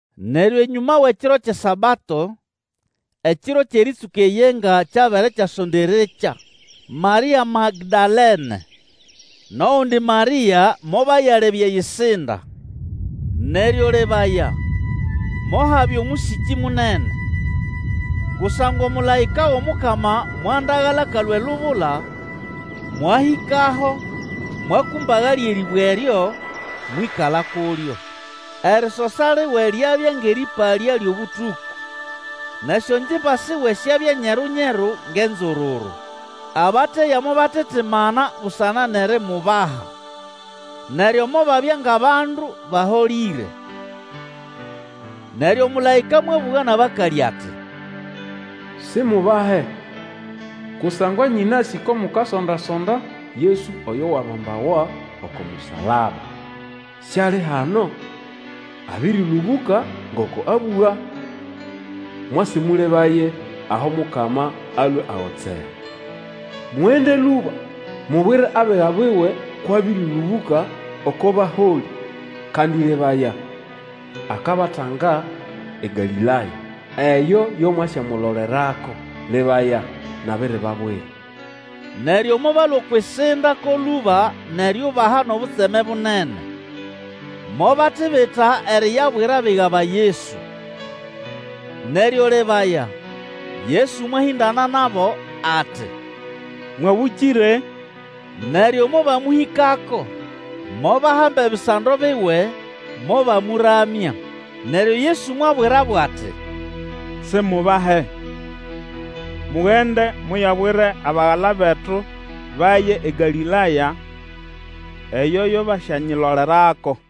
Neryo enyũma wʼekiro kyʼeSabato, ekiro kyʼerĩtsũka eyenga kyabere kyasonda erikya, Marĩa Magdalene nʼogundi Marĩa mobayalebya eyisinda. Neryo lebaya, mohabya omũsĩkĩ munene. Kusangwa omũlaĩka wʼomukama mwandagala akalũa elubula, mwahĩkaho mwakũmbagalya erĩbwe eryo mwĩkala kulyo. Erisosa liwe lyabya ngʼerĩpalya lyʼobũtũkũ, nʼesyongimba siwe syabya nyeru-nyeru ngʼenzururu. Abateya mobatitimana busana nʼerimubaha, neryo mobabya ngʼabandu baholĩre. Neryo omũlaĩka mwabũga nʼabakalĩ ati, Simubahe, kusangwa nyĩnasĩ ko mukasonda-sonda Yesu oyo wabambawa oko musalaba. Siali hano, abĩrĩlũbũka ngoko abũga! Mwase, mũlebaye aho Mukama alũe agotsere. Mugende lũba, mubwire abiga buwe kwʼabĩrĩlũbũka oko baholĩ, kandi lebaya, akabatanga eGalĩlaya. Eyo yo mwasyamulolerako. Lebaya, nabiribabwira. Neryo mobalũa okwʼisinda ko lũba nʼeriubaha nʼobutseme bunene, mobatibita eriyabwira abiga ba Yesu. Neryo lebaya, Yesu mwahĩndana nabo ati, Mwabũkĩre! Neryo mobamũhĩkako, mobahamba ebisando biwe, mobamũramya. Neryo Yesu mwabwirabo ati, Simubahe; mugende muyabwire abagala betu baye eGalĩlaya, eyo yo basyanyilolerako.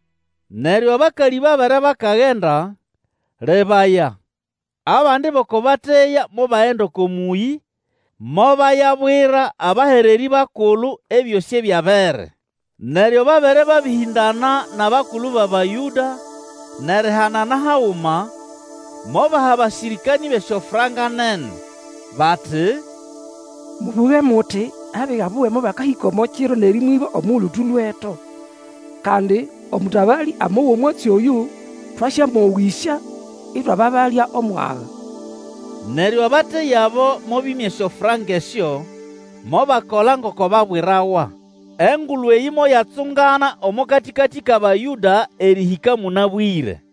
Neryo abakalĩ babere bakagenda, lebaya, abandi bʼoko bateya mobagenda oko mũyĩ, mobayabwira abahererĩ bakulu ebyosĩ ebyabere. Neryo babere babĩhĩndana nʼabakulu bʼAbayũda nʼerihanana haguma, mobaha abasĩrĩkanĩ bʼesyofranka nene, bati, Mũbũge muti, Abiga buwe mobakahĩka omo kiro nʼerĩmwĩba omugulu tũlweto. Kandi omũtabalĩ amowa omwatsi oyũ, twasyamwowĩsya, ĩtwababalya omwaga. Neryo abateya abo mobĩmya esyofranka esyo, mobakola ngoko babwirawa. Engulu eyĩ moyatsungana omo katĩkati kʼAbayũda erĩhĩka mũnabwĩre.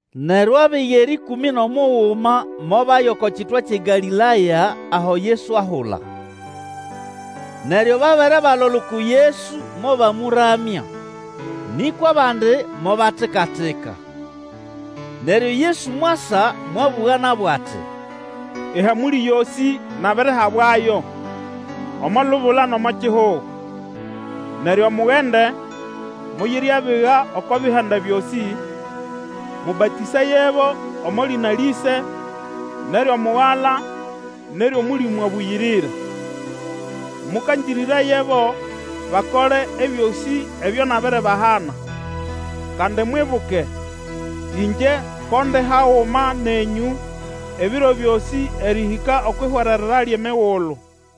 Neryo abiga erĩkũmĩ nʼomuguma mobaya oko kitwa kyʼeGalĩlaya aho Yesu ahula. Neryo babere balola uku Yesu mobamũramya, nĩkwa abandi mobatikatika. Neryo Yesu mwasa mwabũga nabo ati, Ehamũlĩ yosĩ nabirihabwayo omo lubula nʼomo kihugo. Neryo mugende, muyire abiga oko bihanda byosĩ; mũbatĩsayebo omo lĩna lyʼĨse, nʼeryʼOmugala, nʼeryʼOmũlĩmũ Abũyĩrĩre. Mũkangĩrĩrayebo bakole ebyosĩ ebyo nabiribahana. Kandi mwibuke! Ingye ko ndi haguma nenyũ ebiro byosĩ erĩhĩka okwʼihwererera lyʼemigulu.